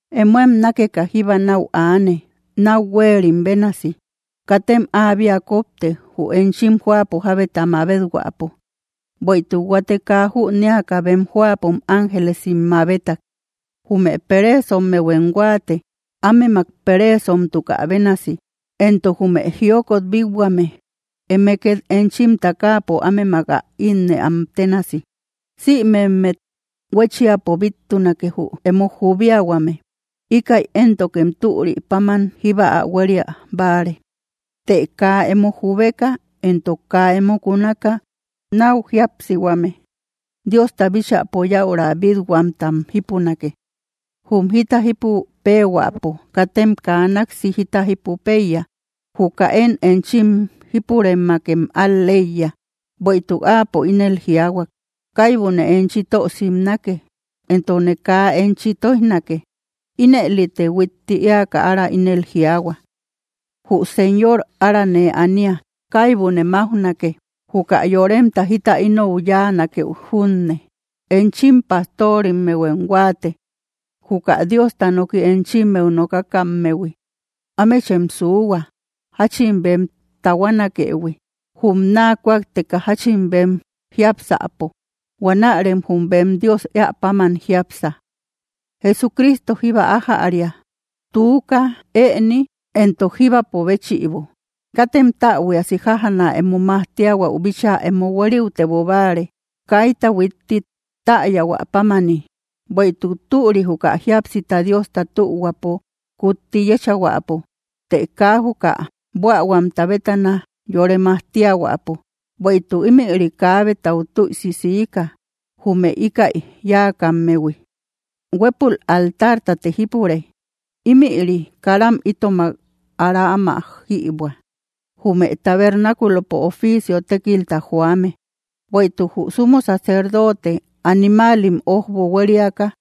Emóem nákeka jíba náu aane, náu huéerim bénasi. Katem áabia kópte, jü enchim jóapo jábeta mabet-huäpo, bueïtuk huate kaa jünéaka bem jóapom ángelesim mabetak. Jume pereesommehuem huáate, ámemak pereesomtuka bénasi, entok jume jiokot bít-huame, eme két enchim takaapo ámemak ä ínnëam ténasi. Sïmemmet huéchiapo bíttunake, jü emo jubiahuame; íkäi éntokem türi páman jíba ä huéria báare; të kaa emo jubeka entok kaa emo kunaka náu jíapsihuame, Diosta bíchäpo yäura bít-huamtam jípunake. Jum jita jípu péehuäpo katem kaa náksi jita jípu péiya; juka én enchim jípurëmakem al‑leiya, bueïtuk Áapo ínel jiaahuak: “Kaibune enchi tö simnake, entokne kaa enchi tóijnake.” Inëlite huitti éaka ára ínel jiaahua: Jü Señor ára nee ania; kaibune máujnake, juka yoremta jita inou yáanakey junne. Enchim pajtorimmehuem huáate, juka Diosta noki enchimmeu nokakammehui. Ámechem suuhua, jáchin bem tahuanakëhui, jum naa kújakteka jáchin bem jiápsäpo. Huanärem jum bem Dios éä páman jiápsa. Jesucristo jíba ájäria, tuuka, ëni, entok jíbapo béchïbo. Katem täbuiasi jájaana emo majtiahuäu bíchaa emo huériutebo báare, kaita huitti täyahuä pámani. Bueïtuk türi, juka jíapsita Diosta tühuapo kutti yéchahuäpo, të kaa juka buähuamta bétana yore majtiahuäpo; bueïtuk ímïri kaabetau tüisi siika, jume íkäi yáakammehui. Huépul altartate jípure; ímïri karam itomak ára áma jïbuä, jume tabernáculopo oficio tékilta joame. Bueïtuk jü sumo sacerdote animaalim ójbo huériaka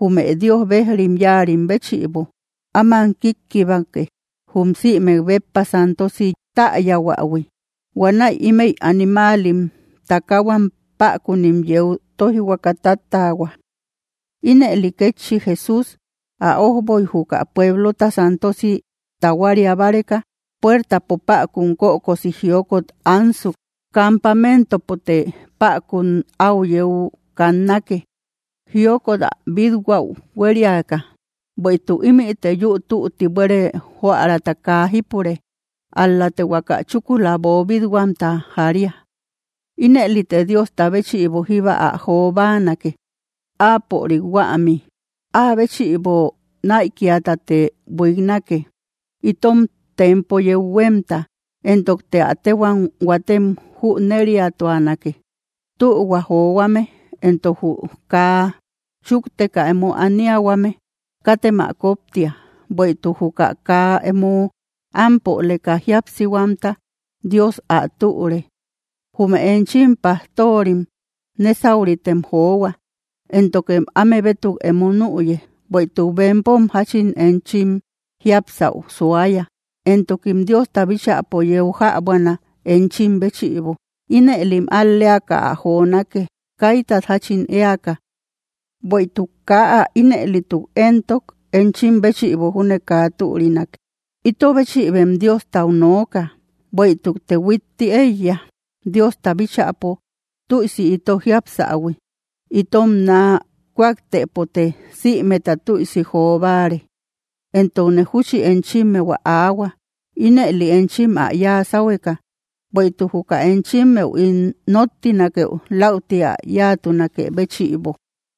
jume Dios bejrim yáarim béchïbo, áman kíkkibake jum sïmek béppa santosi täyahuähui. Huanäi ímëi animaalim takaahuam, päkunim yeu tóijhuaka táttaahua. Ínëli kétchi Jesús, ä ójboy juka pueblota santosi tahuaria báreka, puertapo päkun kökosi jiokot ansuk. Campamentopote päkun áu yeu kannake, jiokot ä bít-huäu huériaka. Bueïtuk ímïte yü tutti buére jóärata kaa jípure; ál‑late huaka chúkula boobit-huamta jaria. Inëlite Diosta béchïbo jíba ä jo báanake, Áapörik huämi. Áa béchïbo näikiatate buiknake, itom tempo yeu huémta, entokte ä téhuam huatem jüneriatuanake. Tühua johuame entok jü kaa chúkteka emo aniahuame, katem ä kóptia; bueïtuk juka kaa emo ámpoleka jíapsihuamta, Dios ä türe. Jume enchim pajtorim nésauritem johua, éntokem áme bétuk emo nüye; bueïtuk bempom jáchin enchim jiapsäu suaya, entokim Diosta bíchäpo yeu jäbuana, enchim béchïbo. Inëlim al‑leaka ä jonake, kaitat jáchin éaka. Bueïtuk kaa ä ínëlituk éntok, enchim béchïbo júne kaa türinake. Ito bechïbem Diostau nooka; bueïtukte huitti éiya, Diosta bíchäpo tüisi ito jiapsähui. Itom naa kújaktëpote sïmeta tüisi jo báare. Entokne júchi enchimmeu ä aahua, ínëli enchim ä yáa sáhueka, bueïtuk juka enchimmeu ín nóttinakeu läuti ä yáatunakë béchïbo.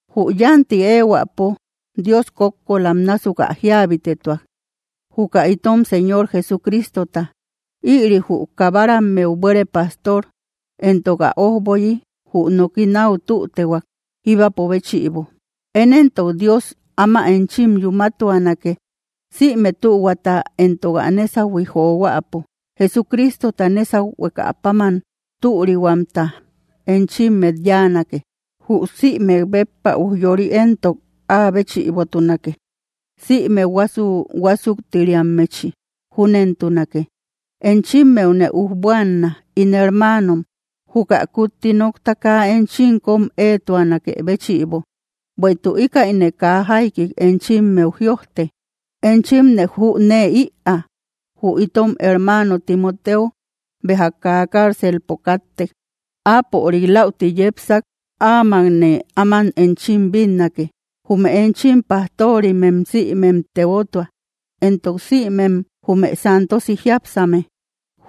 Jü yanti éehuäpo Dios kókkolam násuk ä jíabitetuak, juka itom Señor Jesucristota. Ïri jü kabarammeu buére pastor, entok ä ójboyi jü noki náu tütehuak, jíbapo béchïbo. Én éntok Dios áma enchim yúmatuanake, sïme tühuata entok ä nésahui johuäpo. Jesucristota nésahuekäpáman türihuamta enchimmet yáanake. Jü sïmek béppa ujyori éntok áa béchïbotunake, sïme huasu‑huasuktiriammechi. Júnentunake. Enchimmeune ujbuanna, ín hermaanom, juka kutti nokta kaa enchim kom éetuanakë béchïbo; bueïtuk íkäine kaa jaikik enchimmeu jïojte. Enchimne jünee ïaa, jü itom hermaano Timoteo béja kaa cárcelpo káttek. Áapörik läuti yepsak, áamakne áman enchim bínnake. Jume enchim pajtorimem sïmem tebotua, entok sïmem jume santosi jiápsame.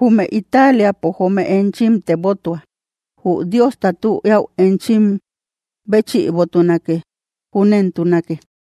Jume Italiapo joome enchim tebotua. Jü Diosta tü eäu enchim béchïbotunake. Júnentunake.